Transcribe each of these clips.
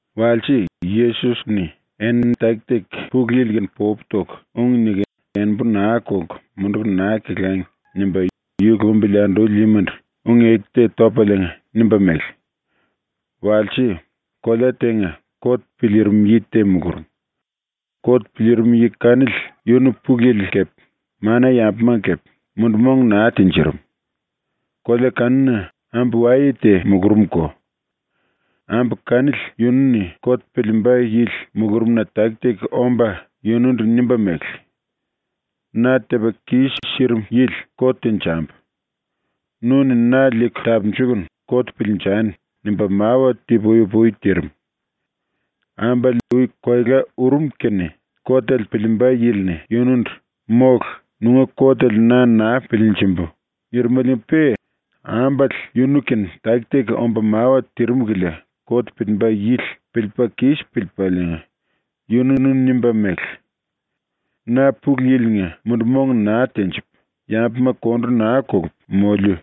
Walse, Yesos-ni ‘Enini taki-taki Pulu Yili-kene popu toku ung niku enembu naa kolku munduku naa kelangi.’ nimba yu lumbili anduli yimandu ung-eku te topaliinga nimba mele: “Walse, kolea tenga kot piliirim yi te mulurum. Kot piliirim yi kanili yunu Pulu Yili kepe mana-yambumanga kepe, mundu-mong naa tinjirim. Kolea kanuna ambu-waye te mulurumko. Ambu kanili yunu-ni kot piliimba yili mulurumna taki-taki omba yunundu nimba mele: “Na tepa kis-sirim yili kot tenjambu. Nu-ni na liiku tapunjukunu kot piliinjani.” nimba mawa ti-pui-upui tirim. Ambale ui koela urum kene kotele piliimba yili-ni yunundu “Mólu, nunga kotele na naa piliinjimbu.” nirimeliinga-pe ambale yunu-kene taki-taki omba mawa tirim kilia kot piliimba yili piliipa kis piliipaliinga yununu nimba mele: ‘Na Pulu Yili-nga mundu-mong naa tenjipu, yambuma kondu naa kolupu moliu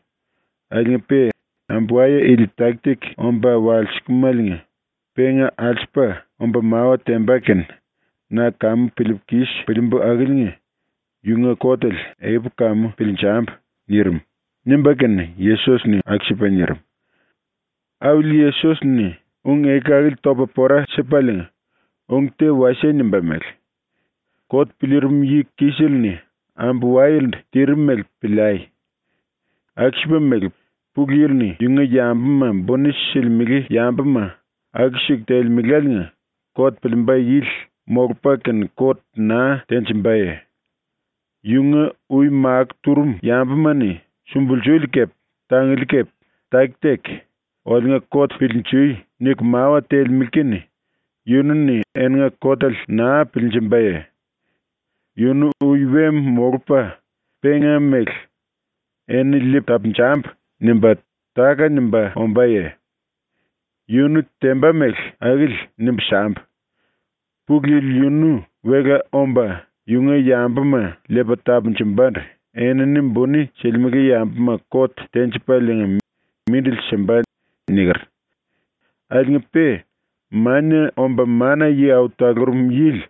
akiliinga-pe ambu-waye ili taki-taki omba walsilimáliinga penga alsupa omba mawa temba kene na kamu piliipu kis piliimbu akiliinga yunga kotele ekupu kamu piliinjambu.’ nirim.” ⸤nimba kene Yesos-ni⸥ aku-sipa nirim. Auli ⸤Yesos-ni ung-eku akili topa pora sipaliinga⸥ ung te wasie nimba mele: “Kot piliirim yi-kisele-ni ambu-wayelendu tirim mele piliai. Aku-sipa mele Pulu Yili-ni yunga yambuma buni silimele yambuma aku-siku telemeláliinga kot piliimba yili molupa kene kot naa tenjimbaye? Yunga ui makó turum yambuma-ni sumbulsuli kepe tanguli kepe taki-taki “Oliunga kot piliinjui.” niku mawa telemele kene yunu-ni eninga kotele naa piliinjimbaye? Yunu ui we molupa penga mele “Enini liipu tapunjambu.” nimba táka-nimba ombáye? Yunu temba mele akili nimbu sambu: “Pulu Yili yunu wela omba yunga yambuma liipa tapunjumbandu enini buni silimele yambuma kot tenjipaliinga mindili simba.” niker. Akiliinga-pe Mania Omba Mana-Yi Au Talurum Yili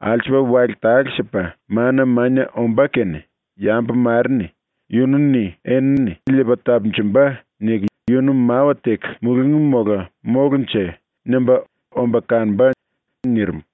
alsupa wale tale-sipa mana mania ombá kene “Yambu mare-ni ‘Yunu-ni enini liipa tapunjumba.’ niku yunu mawa teku mulungí mola mólunje?” nimba omba kanomba.” nirim.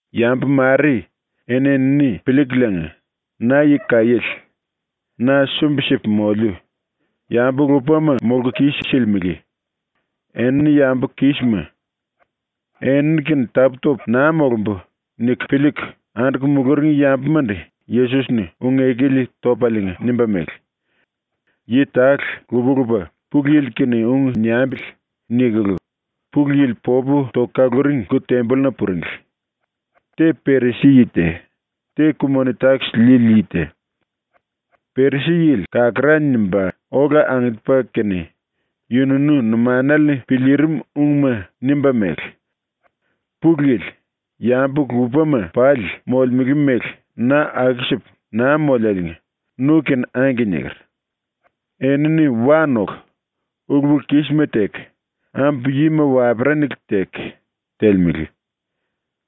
Yambu mare eni-enini piliikuliinga ‘Na yi kaiéle. Na sumbi-sipu moliu, yambu-lupama molku kis-silimele. Enini yambu kísima. Enini-kene tapú-topu naa molumbu.’ niku piliiku anduku muluring yambumandu Yesos-ni ung-eku ili topaliinga nimba mele: “Yi tale lupa-lupa ‘Pulu Yili-kene ung niambili.’ nikulu Pulu Yili popu toku kaluring lku-tembolluna puringli. Te Perisi-yi te, te ku-moni-takis liili yi te. Perisi-yili kakará nimba ola angiliipa kene yununu numanale-ni piliirim ungma nimba mele: “Pulu Yili, yambu-lupama pali molemele mele na aku-sipu naa moliáliinga nu-kene “Angke” niker. Enini wa noku, ulu-pulu-kisma teku, ambu yima waperanale teku, telemele.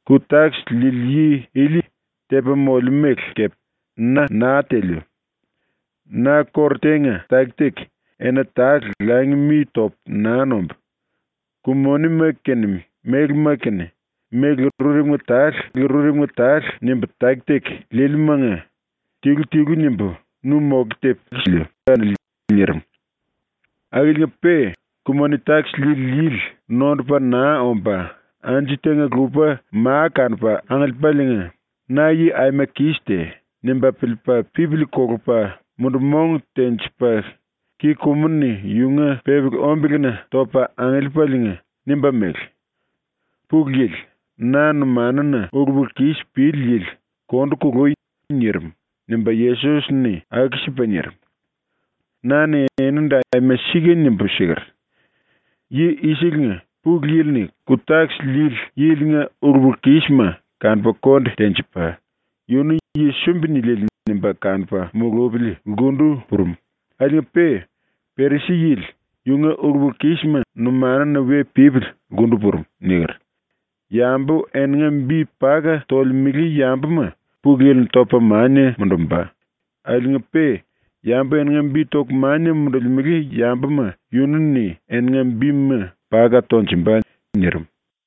Ku-takis liili yi ili tepa molemú mele kepe na naa teliu. Na kóru tenga taki-taki ena tale langi mi topu naa nombu, ku-monima kene mélema kene méle rurepunga tale nimbu taki-taki liiliumanga tilu-tilu nimbu nu moke tepu siliu kanili.” nirim. Akiliinga-pe ku-moni-takis liili yili nondupa naa omba anju tenga-lupa ma kanupa angiliipaliinga, ‘Na yi aima kis te.’ nimba piliipa pipili kolopa mundu-mong tenjipa ki-kumu-ni yunga pepeli-ombelena topa angiliipaliinga nimba mele: “Pulu Yili, na numanuna ulu-pulu-kis pili yili kondu kului.” nirim.” ⸤nimba Yesos-ni aku-sipa nirim.⸥ “Na-ni enindu aima sika nimbu siker: “Yi i-selenga Pulu Yili-ni ku-takis liili yilinga ulu-pulu-kísima kanupa konde tenjipa, yunu ‘yi sumbi-niliele.’ nimba kanupa mulupili lkundu purum, akiliinga-pe Perisi-yili yunga ulu-pulu-kísima numanuna we pípili lkundu purum.” niker. Yambu eninga bi paka tolemele yambuma Pulu Yili-ni topa mania mundumba, akiliinga-pe yambu eninga bi toku mania mundulimele yambuma yunu-ni eninga bima paka tonjumba.” nirim.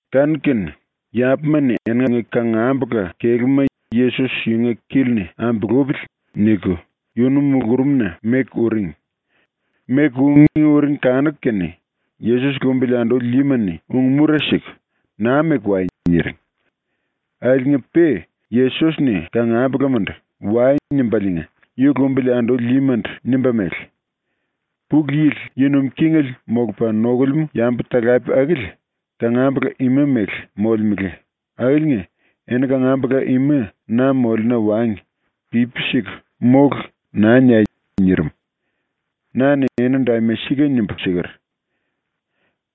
Kanu-kene yambuma-ni eninga kangambula kelúma ‘Yesos yunga kili-ni ambulupili.’ niku yunu mulurumna meku uring. Meku ungí uring kanuku kene Yesos lumbili anduli yima-ni ung-mura siku ⸤“Naa meku wai.”⸥ niring. Akiliinga-pe Yesos-ni kangambulamandu “Wai.” nimbaliinga ⸤yu lumbili anduli yimandu⸥ nimba mele: “Pulu Yili yi nuim kingele molupa nokulemú yambu-talape akili kangambula ima mele molemele akiliinga eni kangambula ima na moliuna wangi pipi siku “Mólu.” naa niai.” ⸤nirim.⸥ “Na-ni enindu aima sika nimbu siker: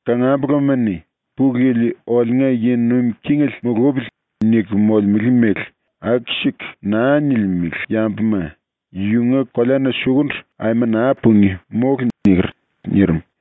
“Kangambolama-ni ‘Pulu Yili oliunga yi nuim kingele mulupili.’ niku molemele mele aku-siku naa nilimele yambuma yunga koleana sukundu aima naa pungí, mólu.” niker.” nirim.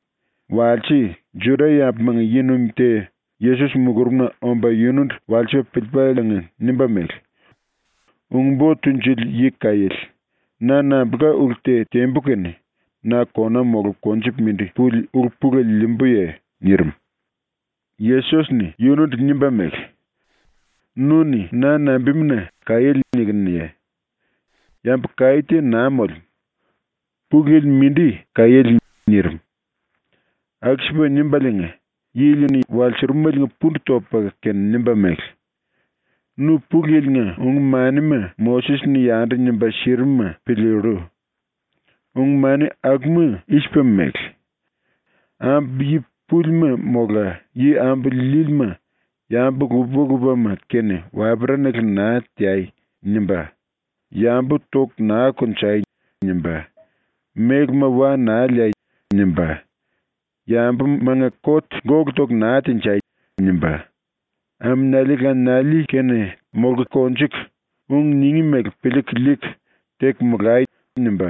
⸤Walse Juda-yambumanga⸥ yi-nuim te Yesos mulurumna omba yunundu walsipa piliipaliinga nimba mele: “Ung-Bo Tunjuli Yi Kaiéle, na nambulka ulu te tembu kene na kona molupa konjupa mindi puli ulu-pulele liimbuye?” nirim. Yesos-ni yunundu nimba mele: “Nu-ni na nambimuna “Kaiéle.” nikinuye? Yambu kaí te naa molemú. Pulu Yili mindi kaiéle.” ⸤nirim.⸥ ⸤Aku-sipa nimbaliinga yili-ni walsurumeliinga pundu topa kene nimba mele:⸥ “Nu ⸤Pulu Yili-nga⸥ ung-manima ⸤Moses-ni yandu nimba sirim-ma⸥ piliillu. ⸤Ung-mani akuma i-sipa mele⸥: “Ambu yi púlima mola yi ambu líílima yambu lupa-lupama-kene waperanale naa teai.” nimba, “Yambu toku naa konjai.” nimba, “Mélema wa naa liai.” nimba, “Yambumanga kot gólu toku naa tenjai.” nimba, “Aminiali laniali kene teku konjuku, ung ningí mele piliiku liiku teku molai.” nimba,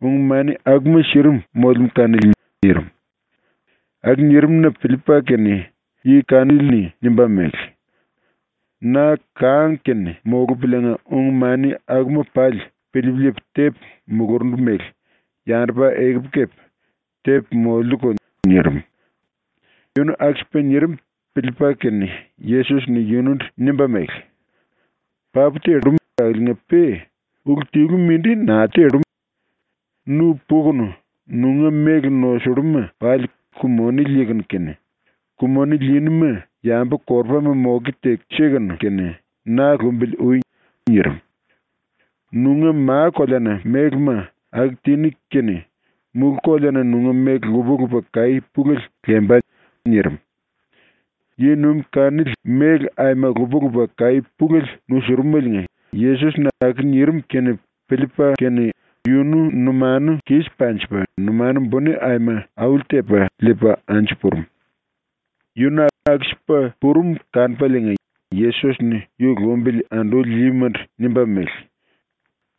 ung-mani akuma sirim molemú kanili.” nirim. Aku nirim-na piliipa kene yi kanili-ni nimba mele: “Na kang-kene molupuliinga ung-mani akuma pali piliipu liipu tepu mulurundu mele yandupa ekupu kepe tepu moliuko.” nirim. Yunu aku-sipa nirim piliipa kene Yesos-ni yunundu nimba mele: “Papu tellu akiliinga-pe ulu tilu mindi naa tellu. Nu pukunu nunga méle nosulluma pali ku-moni liikunu kene, ku-moni liiníma yambu-korupama moke teku sikunu kene na lumbili ui.” nirim. “Nunga ⸤ma-koleana⸥ mélema aku tiní kene mulú-koleana nunga méle lupa-lupa kaí pulele lemba.” nirim. Yi-nuim kanili méle aima lupa-lupa kaí pulele nusurumeliinga Yesos-ni aku nirim kene piliipa kene yunu numanu kis panjipa numanu buni aima auli-tepa liipa anju purum. Yunu aku-sipa purum kanupaliinga Yesos-ni yu lumbili anduli yimandu nimba mele: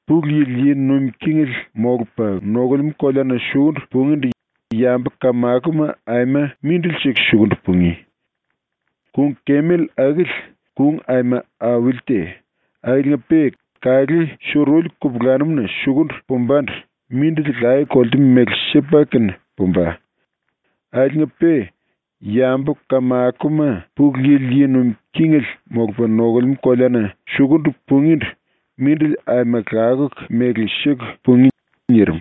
“Pulu Yili yi nuim kingele molupa nokulemú koleana sukundu pungíndu yambu-kamakoma aima mindili-siku sukundu pungí. Kung-kemel akili ⸤kung aima auli te akiliinga-pe⸥ kalé suruli kupulanum-na sukundu pumbandu mindili laye-kolte mele sipa kene pumba. Akiliinga-pe yambu-kamakoma Pulu Yili yi nuim kingele molupa nokulemú koleana sukundu pungíndu mindili aima lakuku mele siku pungí.” nirim.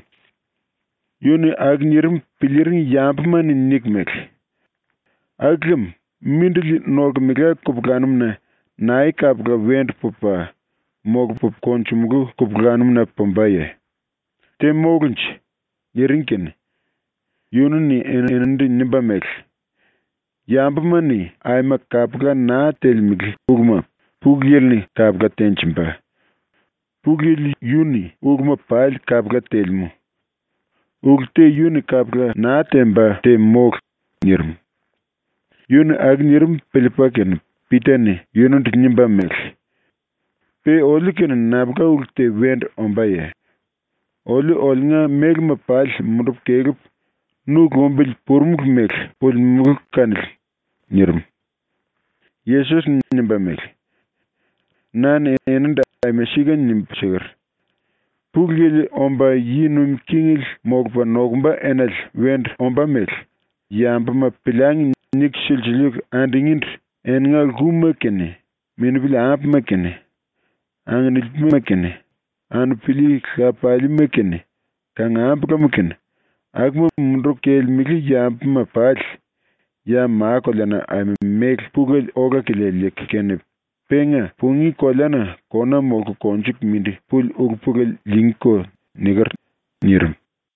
Yu-ni aku nirim piliiring yambuma-ni niku mele: “Aku lem mindili nolkemela kupulanum-na nae kapula wendu pupa, molupu konjumulú kupulanum-na pumbaye? Te mólunje?” niring kene yunu-ni eninindu nimba mele: “Yambuma-ni aima kapula naa telemele uluma Pulu Yili-ni kapula tenjimba. Pulu Yili yu-ni uluma pali kapula telemú. Ulu te yu-ni kapula naa temba te mólu.” nirim. ⸤Yu-ni aku nirim piliipa kene⸥ Pita-ni yunundu nimba mele: “⸤Pe oliu-kene nambulka ulu te wendu ombáye?⸥ Oliu oliunga mélema pali mundupu kelepu nu lumbili purumulu mele pulimulu kanili.” nirim. Yesos-ni nimba mele: “Na-ni enindu aima sika nimbu siker: ‘Pulu Yili omba yi nuim kingele molupa nokumba enale wendu ombá mele “Yambuma piliangi.” niku silsiliiku andungíndu eninga lkuma kene, minupili-ambuma kene, anginipilima kene, anupili lapaliima kene, kangambulama kene, akuma munduku kelemele yambuma pali ya ma-koleana aima méle pulele ola-kilia liiku kene penga pungí koleana kona molku konjuku mindi puli ulu-pulele liingíko.’ niker.” nirim.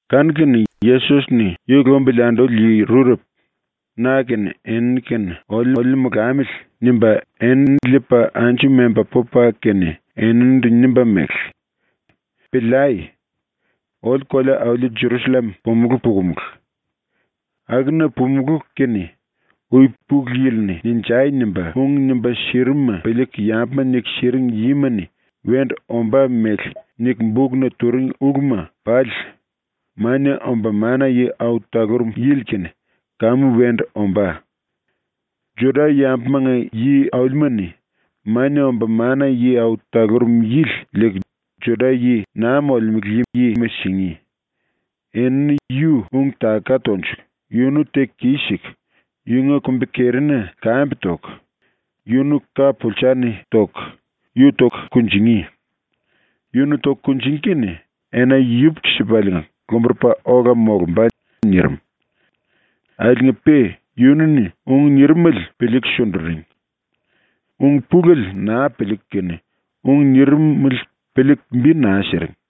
Kanu-kene Yesos-ni ⸤yu lumbili anduli⸥ yi rurepu ‘na kene enini kene oliuliu molamili.’ nimba enini liipa anju memba pupa kene eninindu nimba mele: “Piliai. Oliu kolea-auli Jerusallem pumulú pukumulu. Akuna pumulú kene ui Pulu Yili-ni “Ninjai!” nimba ung nimba sirim-ma piliiku yambuma niku siring yima-ni wendu ombá mele niku bukna turing uluma pali Mania Omba Mana-Yi Au Talurum Yili-kene kamu wendu ombá. Juda-yambumanga yi-aulima-ni Mania Omba Mana-Yi Au Talurum Yili liiku Juda-yi naa molemele yima singí. Enini yu ung-taka tonjuku yunu teku kis-siku yunga kumbi-kerina lkambe toku, yunu ka-pulsa-ni toku yu toku kunjingí. Yunu toku kunjingí kene ena yupuku-sipaliinga lomburupa ola molumba.” nirim. Akiliinga-pe yunu-ni ung nirimele piliiku sunduring. Ung-pulele naa piliiku kene ung nirimele piliiku bi naa siring.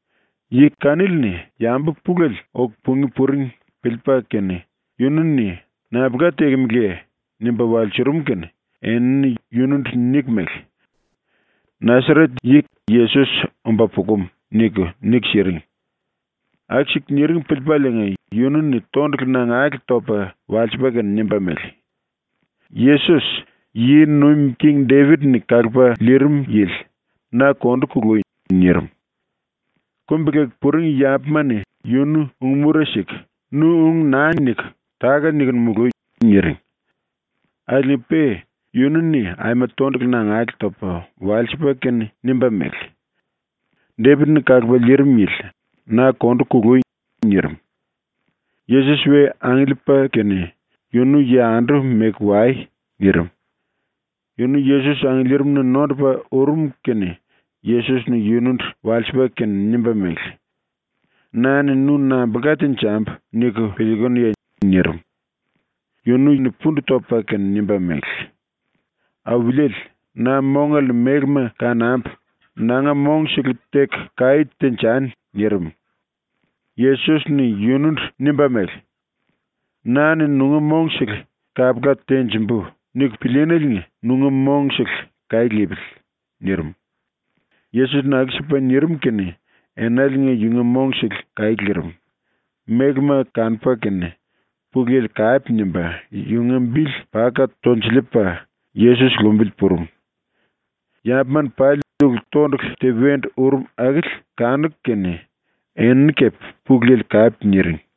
Yi kanili-ni yambu pulele oku pungí puring piliipa kene yunu-ni “Nambulka tekemeleye?” nimba walsurum kene enini yunundu niku mele: “Nasaret-yi Yesos omba pukum.” niku, niku siring. Aku-siku niring piliipaliinga yunu-ni tondulu nangale topa walsipa kene nimba mele: “Yesos, ⸤yi nuim king⸥ Depit-ni kalupa liirim yili, na kondu kului.” nirim. Kumbi-leku puring yambuma-ni yunu ung-mura siku “Nu ung naa niku táka-nikunu mului.” niring. Akiliinga-pe yunu-ni aima tondulu nangale topa walsipa kene nimba mele: “Depit-ni kalupa liirim yili, na kondu kului.” nirim. Yesos we angiliipa kene “Yunu yandu meku wai.” nirim. Yunu Yesos angiliirimna nondupa urum kene Yesos-ni yunundu walsipa kene nimba mele: “Na-ni nu nambulka tenjambu niku piliikunuye?” nirim. Yunu-ni pundu topa kene nimba mele: “Auliele, na mongale-ni mélema kanambu nanga mongsele teku kaí tenjani.” nirim. Yesos-ni yunundu nimba mele: “‘Na-ni nunga mongsele kapula tenjimbu.’ niku pilííneliinga nunga mongsele kaí lipili.” nirim. Yesos-ni aku-sipa nirim kene enaliinga yunga mongsele kaí lirim, mélema kanupa kene Pulu Yili kape nimba yunga bili paka tonjiliipa Yesos lumbili purum. Yambuma-ni pali ulu⸤-tondulu te wendu urum⸥ akili kanuku kene enini kepe Pulu Yili kape niring.